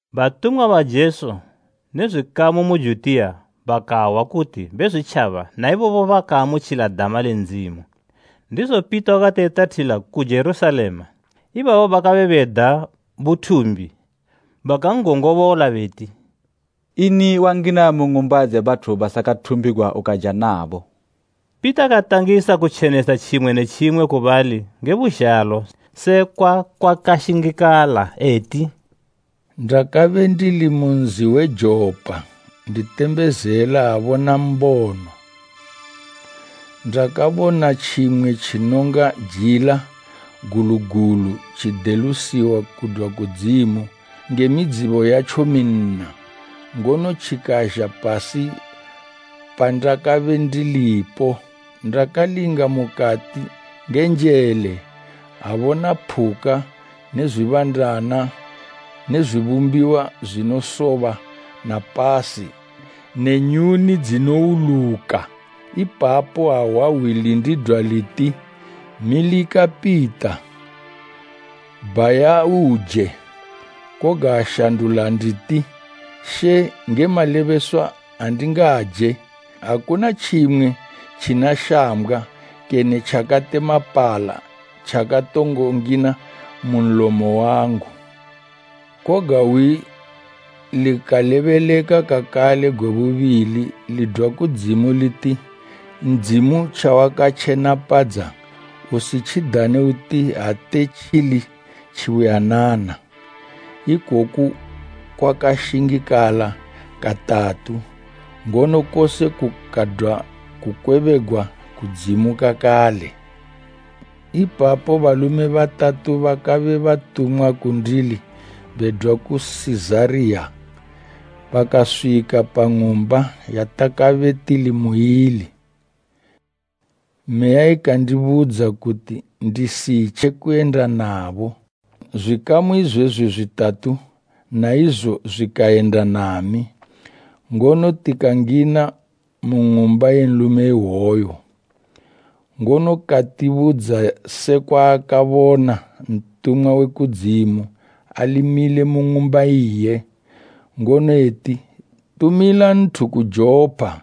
Batumwa ba Jesu ne zwikamu mu Judiya bakahwa kuti Bezwitjaba na ibobo bakaamutjila dama le Ndzimu. Ndizo Pita wakati etathila ku Jerusalema ibabo bakabe beda buthumbi bakan'gongobola beti, “Ini wangina mu ng'umba dze bathu basakathumbigwa ukaja nabo?” Pita katangisa kutjenesa tjimwe ne tjimwe ku bali nge buzhalo sekwa kwakashingikala eti: “Ndakabe ndili mu nzi we Jopa nditembezela, abona mbono. Ndakabona tjimwe tjinonga jila gulu gulu tjidelusiwa kudwa kudzimu nge midzibo yatjo minna, ngono tjikazha pasi pandakabe ndilipo. Ndakalinga mukati nge njele, abona phuka ne zwibandana ne zwibumbiwa zwinosoba na pasi ne nyuni dzinowuluka. Ipapo ahwa hwi lindidwa liti, ‘Milika Pita, bhaya uje!’ Koga ashandula nditi, ‘She nge malebeswa andingaje! Akuna tjimwe tjina shambgwa kene tjakatemapala tjakatongo ngina mu nlomo wangu!’ Koga hwi likalebeleka kakale gwe bubili lidwa kudzimu liti ‘Ndzimu tjawakatjenapadza usitjidane uti ate tjili tjibuyanana.’ Ikoku kwakashingikala katatu, ngono kose kukadwa kukwebegwa kudzimu kakale. Ipapo balume batatu bakabe batumwa kundili bedwa ku Sizariya bakaswika pa ng'umba yatakabe tili muili. Meya ikandibudza kuti ndisitje kuyenda nabo. Zwikamu izwezwi zwitathatu na izo zwikayenda nami, ngono tikangina mu ng'umba ye nlume iwoyo. Ngono katibudza sekwa akabona ntumwa we kudzimu ali mile mu ng'umba iye, ngono eti, ‘Tumila nthu ku Jopa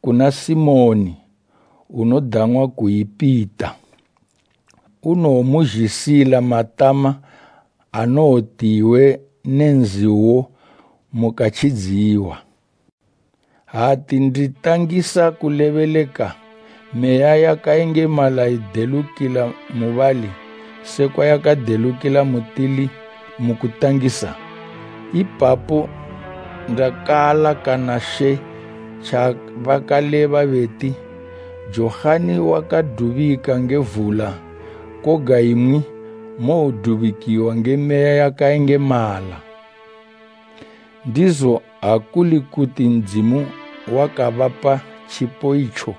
kuna Simoni unodang'wa kuyi Pita. Unowomuzhisila matama anowoti iwe ne nzi uwo mukatjidziwa.’ Ati nditangisa kulebeleka Meya yakayengemala ikadelukila mubali sekwa yakadelukila mutili mu kutangisa. Ipapo ndakaalakana She tjabakaleba beti, ‘Johani wakadubika nge vula koga imwi mowodubikiwa nge Meya yakayengemala.’ Ndizo ha kuli kuti Ndzimu wakabapa tjipo itjo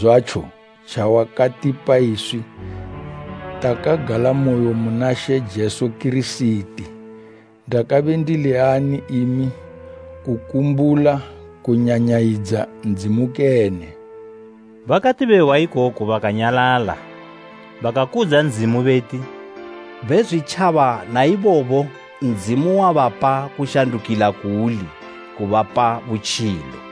zwatjo tjawakatipa iswi takagalamoyo muna She Jesu Kirisiti, ndakabe ndili ani imi kukumbula kunyanyayidza Ndzimu kene?” Bakati behwa ikoku bakanyalala. Bakakudza Ndzimu beti, “Bezwitjaba naibobo Ndzimu wabapa kushandukila kuuli kubapa butjilo.”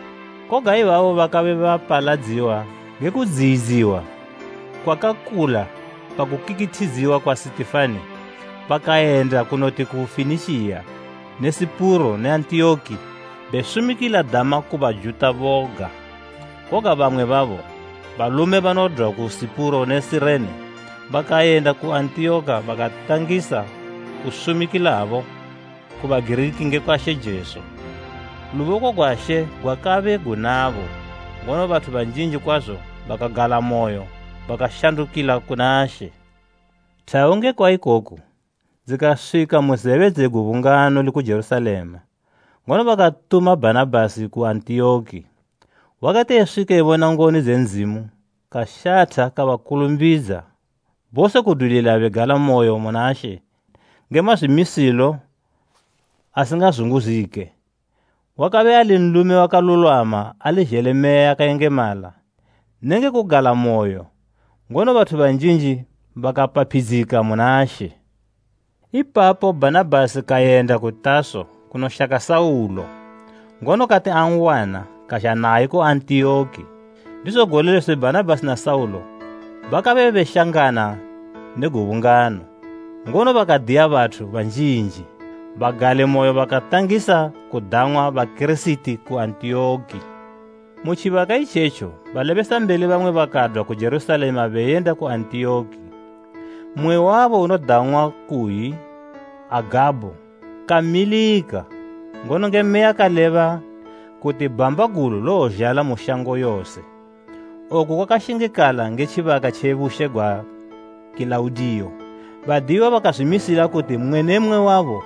Koga ibabo bakabe bapaladziwa nge kudziyidziwa kwakakula pakukikithidziwa kwa Sitifani bakayenda kunoti ku Fenikiya ne Sipuro ne Antiyoki besumikila dama ku Bajuta boga. Koga bamwe babo, balume banodwa ku Sipuro ne Sirene bakayenda ku Antiyoki bakatangisa kusumikilabo ku Bagiriki ngekwa She Jesu. Luboko gwa She gwakabe gunabo, ngono bathu banjinji kwazo bakagalamoyo bakashandukila kuna She. Thawu ngekwa ikoko dzikaswika mu zebe dze gubungano liku Jerusalema ngono bakatuma Bhanabhasi ku Antiyoki. Wakati eswika ebona ngoni dze Ndzimu kashatha kabakulumbidza bose kudwilila begalamoyo muna She nge mazwimisilo asingazunguzike. Wakabe ali nlume wakalulwama ali zhele Meya yakayengemala nenge kugalamoyo, ngono bathu banjinji bakapaphidzika muna She. Ipapo Bhanabhasi kayenda ku Taso kunoshaka Saulo, ngono kati an'wana kazha naye ku Antiyoki. Ndizo gole lose Bhanabhasi na Saulo bakabe beshangana ne gubungano, ngono bakadiya bathu banjinji. Bagalimoyo bakatangisa kudang'wa Bakirisiti ku Antiyoki. Mu tjibaka itjetjo balebesambeli bamwe bakadwa ku Jerusalema beyenda ku Antiyoki. Mmwe wabo unodang'wa kuyi Agabho, kamilika, ngono nge Meya kaleba kuti bhamba gulu lowozhala mu shango yose. Oku kwakashingikala nge tjibaka tje bushe gwa Kilaudiyo. Badiyiwa bakazwimisila kuti mmwe ne mmwe wabo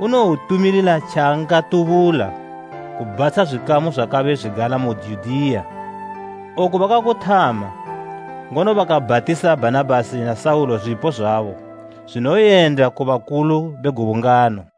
unowotumilila tjaangatubula kubhatsha zwikamu zwakabe zwigala mu Judiya. Oku bakakuthama, ngono bakabhatisa Bhanabhasi na Saulo zwipo zwabo zwinoyenda ku bakulu be gubungano.